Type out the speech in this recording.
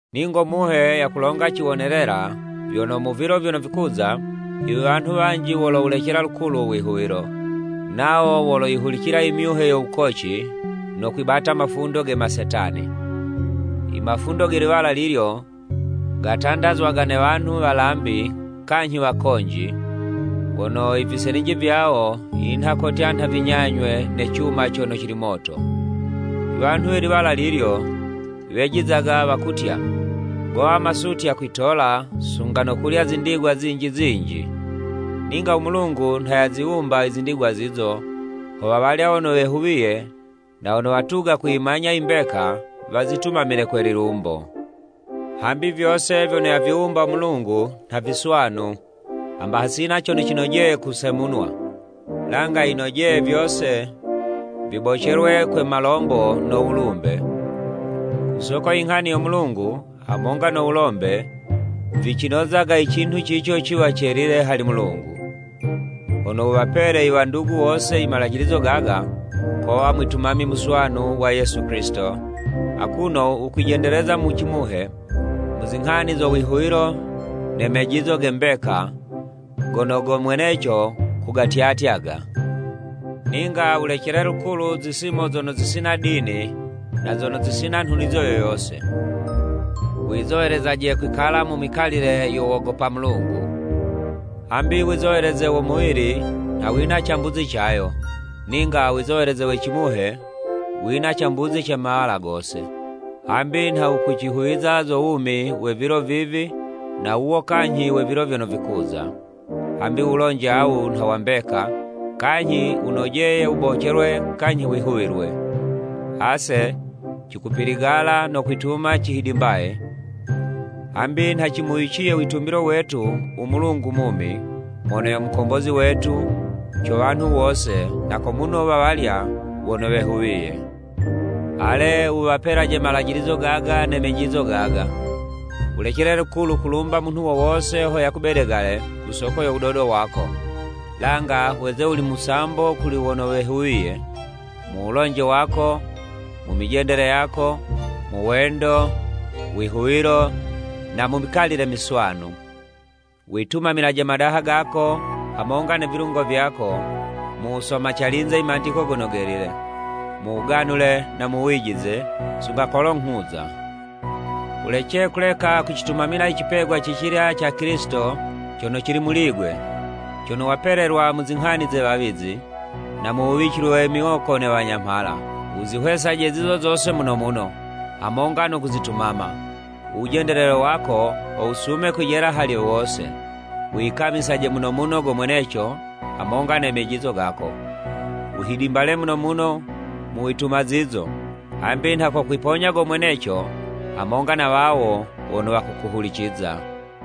Ningo Muhe yakulonga ciwonelela vyono mu vilo vyono vikuza, iwanhu wanji wolowulecela lukulu u wihuwilo, nawo woloyihulicila i myuhe yo wukoci, no kwibata mafundo ge masetani. Imafundo ge liwala lilyo, gatandazwaga ne wanhu walambi kanyhi wakonji, wono i viselinji vyawo vinha kotya nha vinyanywe ne cuma cono cili moto. Iwanhu we liwala lilyo, wejizaga wakutya, gowa masutya kwitola, sunga no kulya zindigwa zinji zinji. Ninga u Mulungu nha yaziwumba i zindigwa zizo, ho wawalya wono wehuwiye na wono watuga kuyimanya imbeka, wazitumamile kwe lilumbo. Hambi vyose vyono yaviwumba Mulungu nha viswanu, hamba hasina cono cinojeye kusemunwa, langa yinojeye vyose vibocelwe kwe malombo no wulumbe, ku soko inghani yo Mulungu hamonga no wulombe, vicinozaga i cinhu cico ciwa celile hali Mulungu. Hono wuwapele i wandugu wose imalajilizo gaga, kowa mwitumami muswanu wa Yesu Kilisito, akuno wukwijendeleza mu cimuhe mu zinghani zo wihuwilo ne mejizo ge mbeka, gono go mweneco kugatyatyaga. Ninga wulecele lukulu zisimo zono zisina dini na zono zisina nhunizo yo yose. Wizowelezaje kwikala mu mikalile yo wogopa Mulungu. Hambi wizoweleze wo muwili nha wina cambuzi cayo, ninga wizoweleze we cimuhe, wina cambuzi ce mawala gose, hambi nha wukucihuwiza zo wumi we vilo vivi na wuwo kanyhi we vilo vyono vikuza. Hambi wulonje awu nha wa mbeka, kanyhi wunojeye wubocelwe kanyhi wihuwilwe. Ase cikupiligala no kwituma cihidimbaye, hambi nha cimuwiciye witumbilo wetu u Mulungu mumi, mono yo Mukombozi wetu co wanhu wose, na ko muno wa walya wono wehuwiye. Ale wuwapelaje malajilizo gaga ne mejizo gaga. Wulecele lukulu kulumba munhu wo wose ho yakubedegale ku soko yo wudodo wako, langa weze wuli musambo kuli wono wehuwiye: mu wulonje wako, mu mijendele yako, mu wendo, wihuwilo, na mu mikalile miswanu. Witumamilaje madaha gako hamonga ne vilungo vyako, mu wusoma calinze Imandiko Gono Gelile, mu wuganule na mu wijize, sunga kolo nghuza. Wulece kuleka kucitumamila i cipegwa cicilya ca Kilisito cono cili muli'gwe, cono wapelelwa mu zinghani ze wawizi, na mu wuwicilwe miwoko ne wanyamhala. Wuzihwesaje zizo zose muno muno, hamonga no kuzitumama, u wujendelele wako ho wusume kwijela hali wose. Wiyikamisaje muno muno go mweneco hamonga ne mejizo gako. Wuhidimbale muno muno mu wituma zizo, hambi nha kokwiponya go mweneco, hamonga na wawo wono wakukuhuliciza.